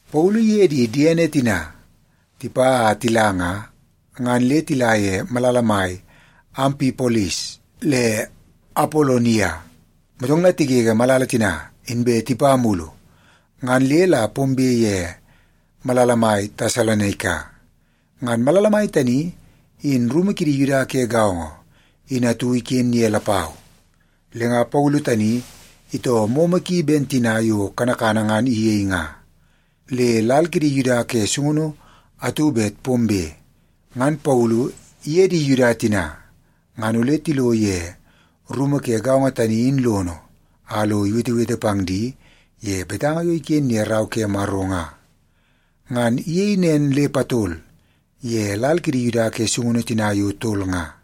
Paulu iye di diene tina tipa a tila nga, ngan le tila ye malala mai Ampipolis le Apolonia. Motong la tigege malala tina, inbe tipa mulu ngan le la pombe ye malala mai Tesalonaika. Ngan malala mai tani in rumu kidi Yuda ke gaongo in atu iken ye lapau. Le nga Paulu tani itoo momo ki ben tina yo kanakana ngan iyei nga. Le lal kidi Yuda ke sungunu atu bet pombe, ngan Paulu iye di Yuda tina ngan ole tilo ye rumu ke gaongo tani in lono a lo iwetewete pang di ye betanga yo iken ye Rau ke Maro nga. Ngan iyei nen le patol ye lal kidi Yuda ke sungunu tina yo tol nga.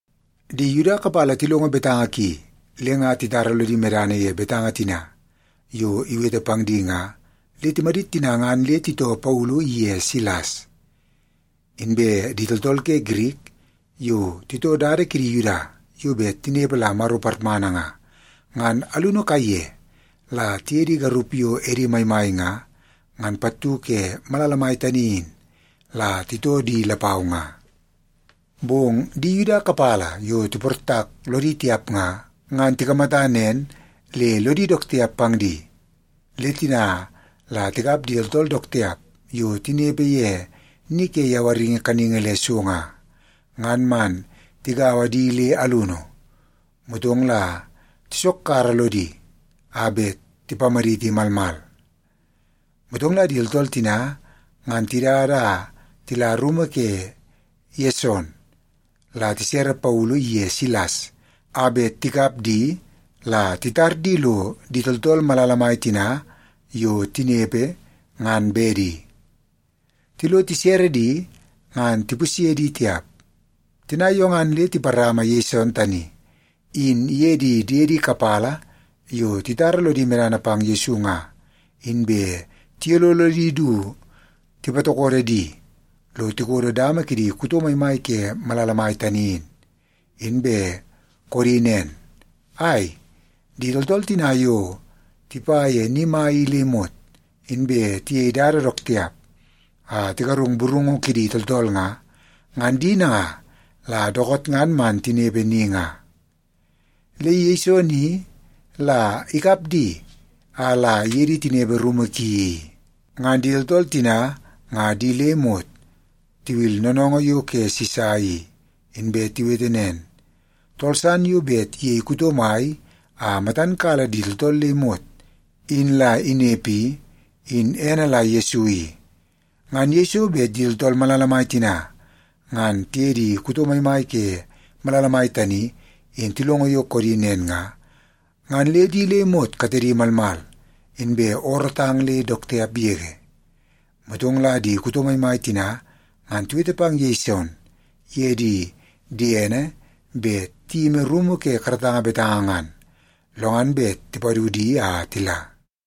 Di Yuda kapala tilongo betanga ki le nga titara lodi medana ye betanga tina yo iwete pang di nga, le timadit tina ngan le titoo Paulu iye Silas. Inbe di tooltool ke Girik yo titoo dada kidi Yuda yo bet tinepe la Maro parmana nga, ngan alunu kaiye la tiye di garup yo edi maimai nga, ngan pattu ke malala mai tani in, la titoo di lapau nga. Bong di Yuda kapala yo tiportak lodi tiap nga, ngan tikamata nen le lodi dook tiap pang di. Le tina la tikap di tooltool dook tiap yo tinepe ye ni ke yawaringi kaningi le so nga, ngan man tigaua di le alunu, motong la tisokkara lodi a bet tipamaditi malmal. Motong la di tooltool tina ngan tidada a tila rumu ke Yeson, la tisere Paulu iye Silas a bet tikap di la titar di lo di tooltool malala mai tina yo tinepe, ngan bedi. Tilo tisere di, ngan tipusye di tiap. Tina yo ngan le tiparama Yeson tani in iye di diedi kapala yo titara lodi medana pang Yesu nga, inbe tiyololo di du tipatokodo di lo tikodo dama kidi kuto maimai ke malala mai tani in, inbe koodi nen, “Ai, di tooltool tina yo tipa ye ni mai i le imot, inbe tiyei dada dook tiap a tigarungu burungu kidi tooltool nga, ngan di nanga la dookoot ngan man tinepe ni nga. Le Yeson i la ikap di a la iye di tinepe rumu ki i. Ngan di tooltool tina nga di le imot tiwil noonoongoo yo ke Sisa i, inbe tiwete nen, ‘Tool san yo bet iyei kuto mai a matan kala di tooltool le imot in la inepe i, in ene la Yesu i.’” Ngan yeiso bet di tooltool malala mai tina ngan tiye di kuto maimai ke malala mai tani in tilongo yo koodi nen nga, ngan le di le imot katedi malmal, inbe oorootang le dook tiap yege. Motong la di kuto maimai tina ngan tiwete pang Yeson iye di diene bet tiyimi rumu ke karatanga betanga ngan, lo ngan bet tipadu di a tila.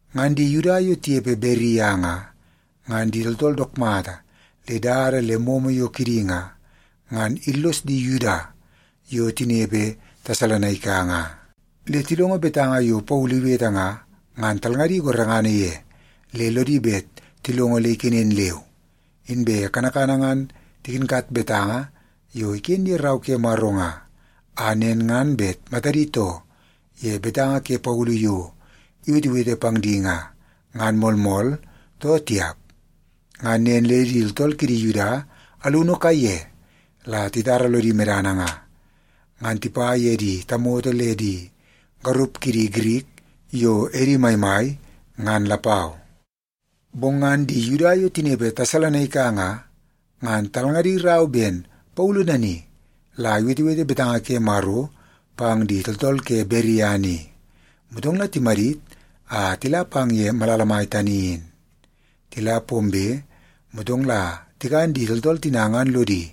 Ngan di Yuda yo tinepe Beria nga, ngan di tooltool dook mata le dada le momo yo kidi nga, ngan illos di Yuda yo tinepe Tesalonaika nga. Le tilongo betanga yo Paulu iwete nga, ngan talngadi gorengana ye le lodi bet tilongo le ikenen leu. Inbe kanakana ngan tikinkat betanga yo iken ye Rau ke Maro nga, a nen ngan bet matadi too ye betanga ke Paulu yo iwetewete pang di nga, ngan moolmool too tiap. Ngan nen le di tooltool kidi Yuda alunu kaiye la titara lodi medana nga, ngan tipa ye di tamoto le di garup kidi Girik yo edi maimai, ngan lapau. Bong ngan di Yuda yo tinepe Tesalonaika nga, ngan talngadi rau ben Paulu nani la iwetewete betanga ke Maro pang di tooltool ke Beria ni, motong la timadit a tila pang ye malala mai tani in. Tila pombe, motong la tikan di tooltool tina ngan lodi,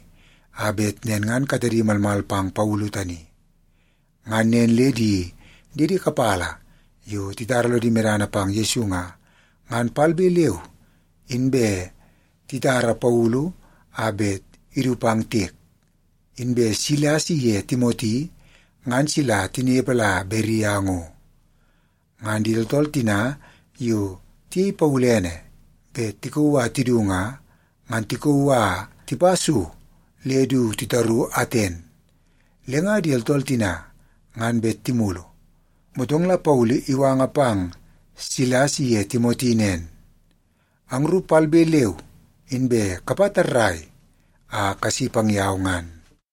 a bet nen ngan katedi malmal pang Paulu tani. Ngan nen le di diedi kapala yo titara lodi medana pang Yesu nga, ngan palbe leu inbe titara Paulu a bet idu pang tiek. Inbe Silas iye Timoti ngan sila tinepe la Beria ngo. Ngan di tooltool tina yo tiyei Paulu ene bet tikauu a tidu nga, ngan tikauu a tipa so le du titaru Aten. Le nga di tooltool tina ngan bet timulu, motong la Paulu iwanga pang Silas iye Timoti nen, “Angru palbe leu inbe kapa tarrai a kasi pang yau ngan.”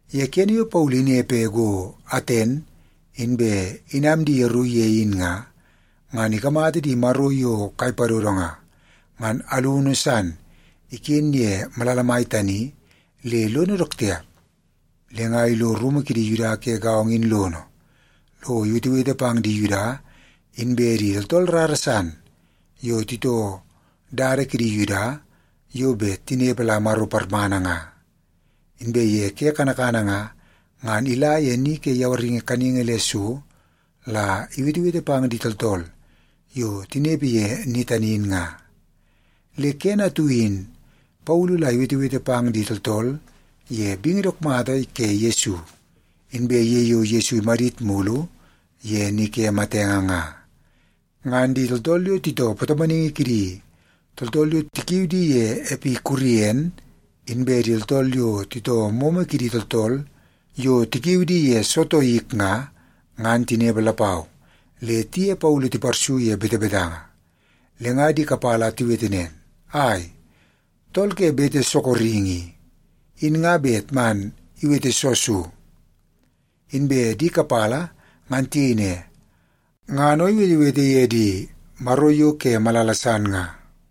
Ye kene yo Paulu inepe go Aten, inbe inam di yeru ye in nga, ngan ikamata di maro yo kai padodo nga, ngan alunu san iken ye malala mai tani le lono dook tiap. Le nga ilo rumu kidi Yuda ke gaongo in lono lo iwetewete pang di Yuda inbe di tooltool rara san yo titoo dada kidi Yuda yo bet tinepe la Maro parmana nga. Inbe ye ke kanakana nga, ngan ila ye ni ke yawaringi kaningi le so la iwetewete pang di tooltool yo tinepe ye ni tani in nga. Le kene atu in Paulu la iwetewete pang di tooltool ye bingi dook mata ke Yesu, inbe ye yo Yesu imadit mulu ye ni ke matenge nga. Ngan di tooltool yo titoo patomonaingi kidi tooltool yo tikiu di ye Epikurien, inbe di tooltool yo titoo momo kidi tooltool yo tikiu di ye Sotoik nga, ngan tinepe lapau, le tiye Paulu tiparsu ye betebetanga. Le nga di kapala tiwete nen, “Ai, tool ke bete sorokingi i, in nga bet man iwete soo so?” Inbe di kapala ngan tiyei ne, “Ngan o iwetewete ye di maro yo ke malala san nga.”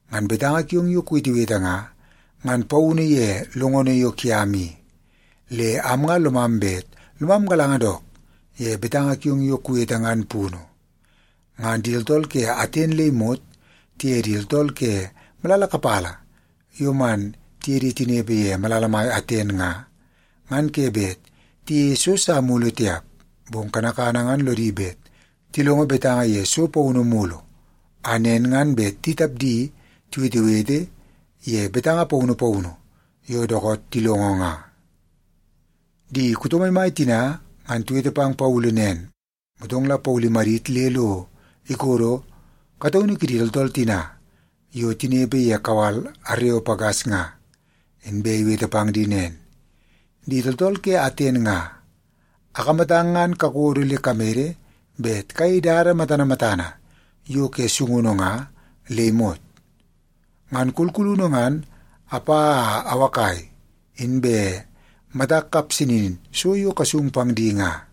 Ngan betanga kiong yo kuwetewete nga, ngan paunu ye longono yo kiam i. Le am nga lomam bet lomam galanga dook ye betanga kiong yo kuwete ngan punu.” (Ngan di tooltool ke Aten le imot tiye di tooltool ke malala kapala yo man tiye di tinepe ye malala mai Aten nga, ngan ke bet tiyeie so sa mulu tiap. Bong kanakana ngan lodi bet tilongo betanga ye so paunu mulu, a nen ngan bet di tapdi tiwetewete ye betanga paunu paunu yo dookoot tilongo nga.) Di kuto maimai tina ngan tiwete pang Paulu nen, motong la Paulu imadit le lo ikodo kataunu kidi tooltool tina yo tinepe ye kawal Areopagas nga, inbe iwete pang di nen, “Di tooltool ke Aten nga, akamatang ngan kakodo le kamede bet kayei dada matana matana yo ke sungunu nga le imot. Ngan kulkulunu ngan apa a awakai, inbe matak kapsanin so yo kasung pang di nga.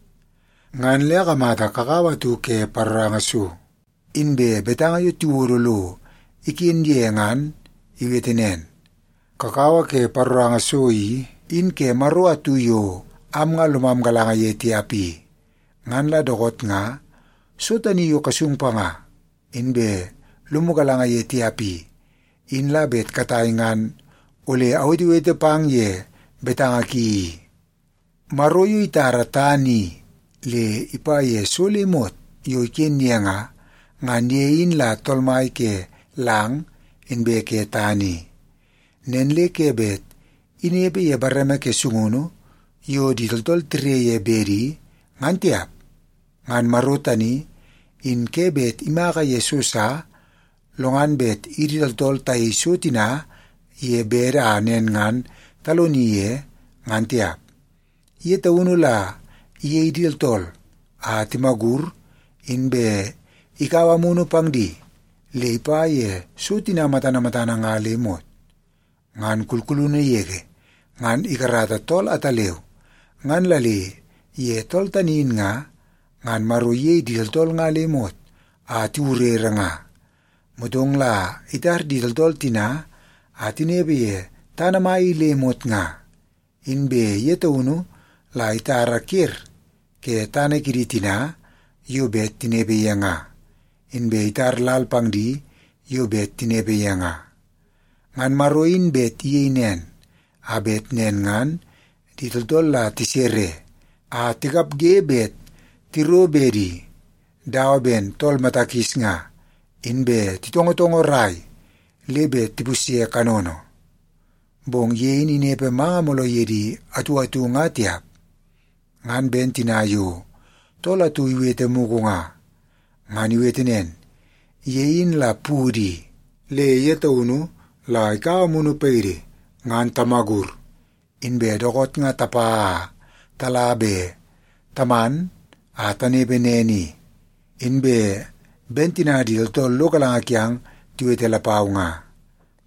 Ngan le akamata kakawa atu ke paroranga so, inbe betanga yo tiwodo lo iken ye ngan iwete nen, ‘Kakawa ke paroranga so i, in ke maro atu yo am nga lomam galanga ye tiap i.’ Ngan la dookoot nga, so tani yo kasung panga inbe lomu galanga ye tiap i, in la bet katai ngan ole awetewete pang ye betanga ki i. “Maro yo itara tana i le ipa ye so le imot yo iken ye nga, ngan ye in la Tool Mai ke lang inbe ke tana i. Nen le ke bet inepe ye bareme ke sungunu yo di tooltool tire ye bedi, ngan tiap. Ngan Maro tani in ke bet imaka ye so sa, lo ngan bet idi tooltool tayei so tina ye bede a nen ngan taloni ye, ngan tiap. Ye taunu la iyei di tooltool a timagur, inbe ikaua amunu pang di le ipa ye so tina matana matana nga le imot. Ngan kulkulunu yege ngan ikarata tool ataleu, ngan la le ye tool tani in nga, ngan Maro iyei di tooltool nga le imot a tiwurere nga. Motong la itar di tooltool tina a tinepe ye tana mai i le imot nga. Inbe ye taunu la itara ker ke tana kidi tina yo bet tinepe ye nga, inbe itar lal pang di yo bet tinepe ye nga. Ngan Maro in bet iyei nen, a bet nen ngan di tooltool la tisere a tikapge bet tiro bedi dawa ben tool mata kis nga, inbe titongotongorai le bet tipusye kanono. Bong ye in inepe manga mooloo yidi atu atu nga tiap. Ngan ben tina yo tool atu iwete mugu nga. Ngan iwete nen, ‘Ye in la pudu i, le ye taunu la ikaua amunu paidi ngan tamagur, inbe dookoot nga tapa a tala be taman a tanepe nen i.’ Inbe ben tina di tooltool lo galanga kiang tiwete lapau nga.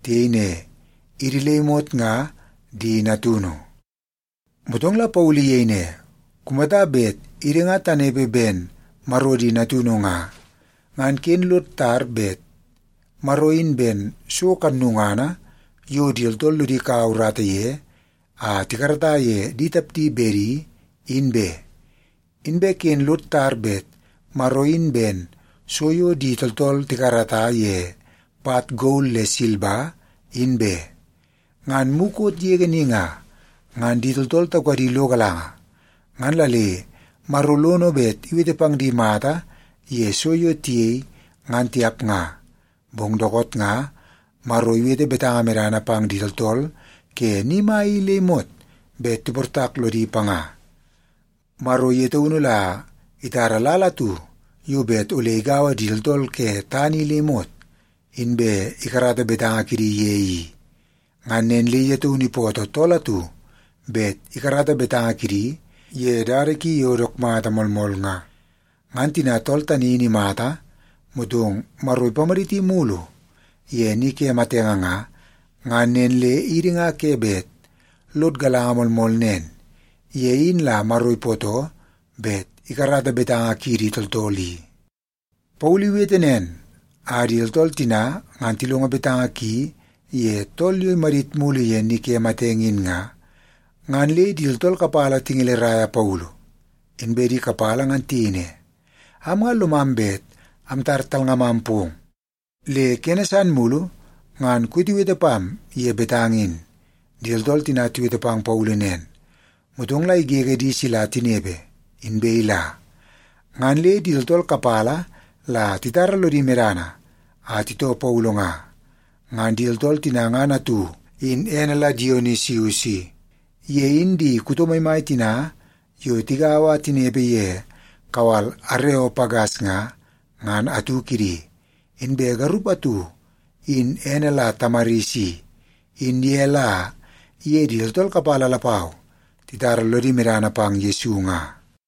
Tiyei ne, ‘Idi le imot nga di natunu.’” Motong la Paulu iyei ne, “Kumata bet idi nga tanepe ben Maro di natunu nga, ngan ken lod tar bet Maro in ben so kannungana yo di tooltool lodi kaua urata ye a tikarata ye di tapdi bedi, in be. Inbe ken lod tar bet Maro in ben so yo di tooltool tikarata ye pat gol le silba, in be. Ngan mukot yege ni nga, ngan di tooltool taukadi lo galanga, ngan la le Maro lono bet iwete pang di mata ye so yo tiyei, ngan tiap nga. Bong dookoot nga, Maro iwete betanga medana pang di tooltool ke ni mai i le imot bet tiportak lodi panga. Maro ye taunu la itara lal atu yo bet ole igaua di tooltool ke tana i le imot, inbe ikarata betanga kidi ye i. Ngan nen le ye taunu ipootoo tool atu bet ikarata betanga kidi ye dada ki yo dook mata moolmool nga. Ngan tina tool tani in imata, motong Maro ipamaditi mulu ye ni ke matenge nga, ngan nen le idi nga ke bet lod galanga moolmool nen, ye in la Maro ipootoo bet ikarata betanga kiidi tooltool i.” Paulu iwete nen a di tooltool tina ngan tilongo betanga ki ye tool yo imadit mulu ye ni ke matenge in nga, ngan le di tooltool kapala tingeleraia Paulu. Inbe di kapala ngan tiyei ne, “Am nga lomam bet amtar talngamam pong, le kene san mulu ngan kuwetewete pam ye betanga in.” Di tooltool tina tiwete pang Paulu nen, motong la igege di sila tinepe, inbe ila. Ngan le di tooltool kapala la titara lodi medana a titoo Paulu nga. Ngan di tooltool tina ngan atu in ene la Dionisius i. Ye in di kuto maimai tina yo tigaua a tinepe ye kawal Areopagas nga, ngan atu kidi. Inbe garup atu in ene la Tamaris i, in ye la iye di tooltool kapala lapau titara lono medana pang Yesu nga.